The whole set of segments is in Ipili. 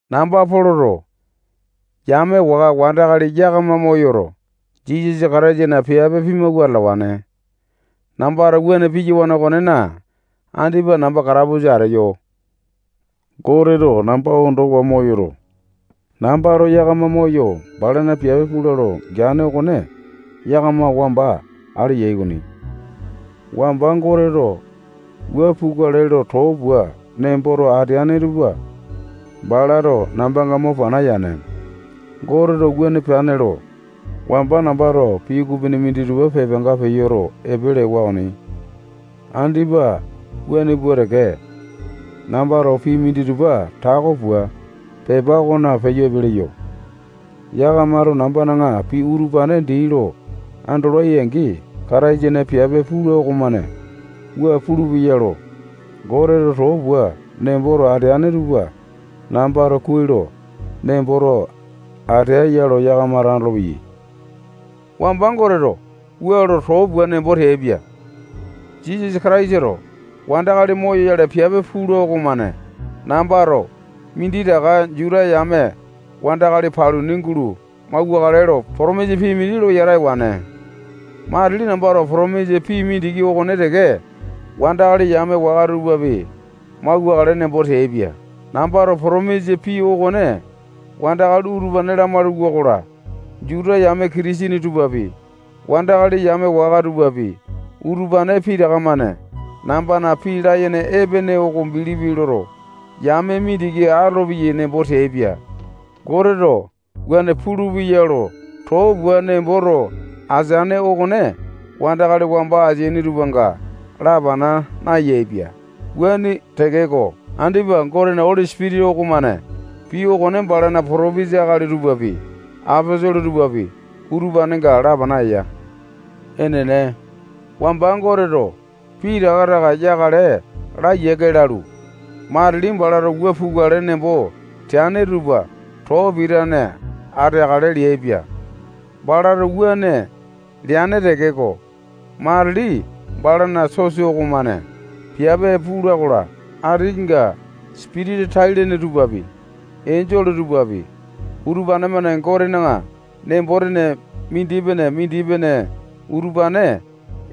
Namba Poloto yame waka wandakali yakama moyoto, Jisasa Kataisana piape pimawua atalawane. Nambato wuane piyawane okonena, andipa namba katapusa ateyo. Goteto namba ondowa moyoto, nambato yakama moyo balana piape pula lo geane okone yakama wamba ale yai okoni. Wamba Goteto wua pukale lo too pua nemboto ateane tupa balato nambanga mo pana yane. Goteto wuane peane lo, wamba nambato pii ukupini minditupa pepanga peyoto epe lewa okoni. Andipa wuane pua teke, nambato pii minditupa tako pua, pepa okona peyo epe leyo. Yakamato nambana pii utupane dii lo andolai-angi, Kataisana piape pula okomane wua pulupeya lo Goteto too pua nemboto ateane tupa nambato kuai lo nemboto ateya lo yakamato andolopeyai. Wamba Goteto wua lo too pua nembo teaipia: Jisasa Kataisato wandakali moyoyale piape pula okomane nambato minditaka Juta yame wandakali paluni gulo mauwakale lo potomisa pii mindi lo yata ewane. Matili nambato potomisa pii mindiki okone teke wandakali yame waka tupapi mauwakale nembo teaipia. Nambato potomisa pii okone wandakali utupane lamalu-wakola, Juta yame Kitisene tupapi, wandakali yame waka tupapi, utupane pitaka-mane nambana pii layene epene oko bilipi loto, yame mindiki atolopeyai nembo teaipia. Goteto wuane lo too pua nemboto ateane okone wandakali wamba ateaini tupanga lapana nayaepia. Wuane tekeko, andipa Gotena Oli Sipitisa okomane pii okone balana potopesa akali tupapi, aposolo tupapi, utupanenga lapana eya. Enene, wamba Goteto pitaka taka yakale laa yiake lalu, matili balato wua pukale nembo teane tupa too pitane ateakale leaipia. Balato wuane leane tekeko, matili balana sosa okomane piape pula-kola, atinga sipitisa tai-lene tupapi, enjole tupapi, utupane-mane Gotena nembo-tene mindipene-mindipene utupane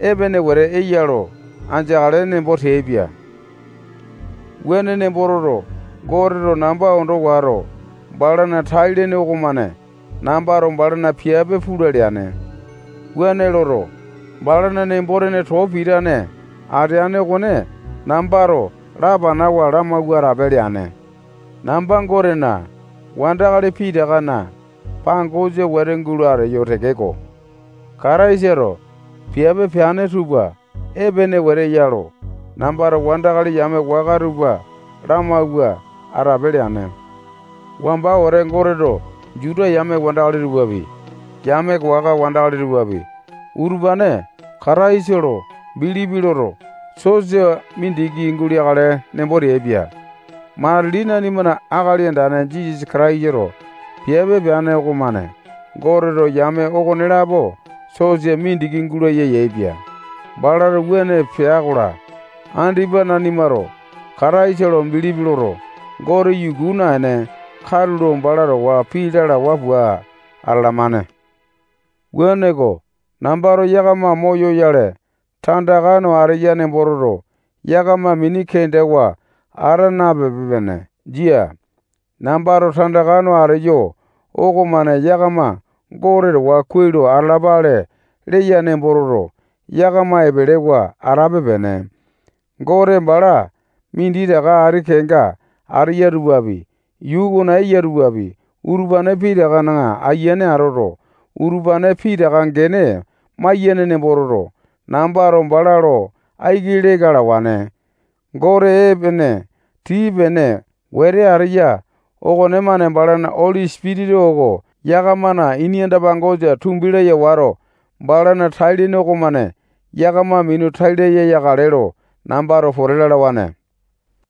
epene wete eya lo andeakale nembo teaipia. Wuane nembo toto, Goteto namba ondo wato, balana tai-lene okomane nambato balana piape pula leane. Wuane loto, balana nembo-tene too pitane ateane okone nambato lapanawa lamawua atape leane. Namba Gotena wandakali pitakana pangosa wete gulo ateyo tekeko, Kataisato piape peane tupa epene wete eya lo nambato wandakali yame waka tupa lamawua atape leane. Wamba wete Goteto Juta yame wandakali tupapi, yame waka wandakali tupapi, utupane Kataisa lo bilipi loto, sosa mindiki guleakale nembo teaipia. Matili nanimana Akali Andane Jisasa Kataisato piape peane okomane Goteto yame okonelapo sosa mindiki gulaya yaepia. Balato wuane pea-kola, andipa nanimato Kataisa lo bilipi loto, Gote yuku naene, katulo bala towa pii lalawa pua atalamane. Wuaneko, nambato yakama moyoyale tandaka no ateya nembo toto, yakama mini kendawa ata napepe-pene. Jia. Nambato tandaka no ateyo okomane yakama Gote towa kuai lo atalapale leya nembo toto, yakama epelewa atape-pene. Gote bala minditaka ati kenga ateyai tupapi, yuu okona eya tupapi, utupane pitakana ayiane atoto, utupane pitaka gene maiyane nembo toto, nambato bala lo aiki leka alawane. Gote epene tii-pene wete ateya okonemane balana Oli Sipitisa oko yakamana ini anda-pangosa tumbi laya wato, balana tai-lene okomane yakama minu tai laya yakale lo nambato pote lalawane.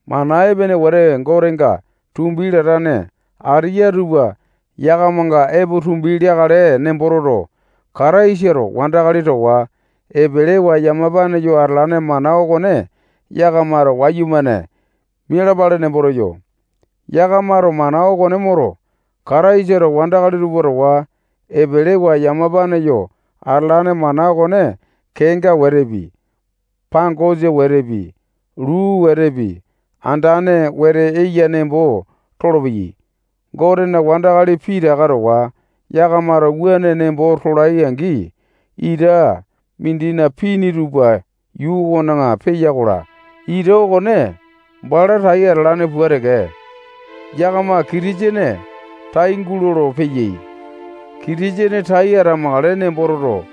Mana epene wete Gotenga tumbi latane ateya tupa yakamanga epo tumbi leakale nembo toto, Kataisato wandakali towa epelewa yamapane yo atalane mana okone yakamato wayumane mialapale nembo teyo. Yakamato mana okone moto, Kataisato wandakali tupa towa epelewa yamapane yo atalane mana okone kenga wetepi, pangosa wetepi, luu wetepi, andane wete eya nembo tolopeyai. Gotena wandakali pitaka towa yakamato wuane nembo tolai angi, ita mindina pini tupa yuu okona peya-kola, ita okone bala tai atalane pua teke, yakama Kitisene tai gulolo-peyai. Kitisene tai atamakale nembo toto,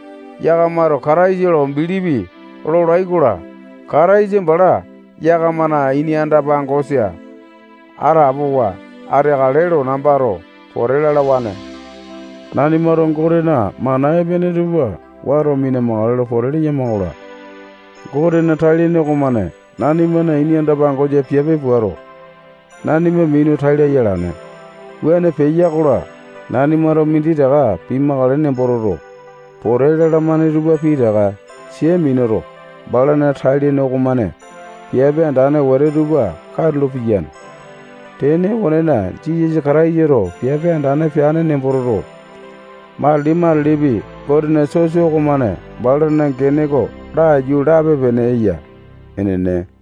yakamato Kataisa lo bilipi lolai-kola, Kataisa bala yakamana ini anda-pangosa atapowa ateakale lo nambato pote lalawane. Nanimato Gotena mana epene tupa wato mina-makale lo pote leyama-kola, Gotena tai-lene okomane nanimana ini anda-pangosa piape puato, nanima minu tai laya alane. Wuane peya-kola, nanimato minditaka pimakale nembo toto, pote lalamane tupa pitaka sia minuto, balana tai-lene okomane piape andane wete tupa katulo piyane. Tene okonena, Jisasa Kataisato piape andane peane nembo toto, matili-matilipi Gotena sosa okomane balana gene oko laiyu lape-pene eya. Enene.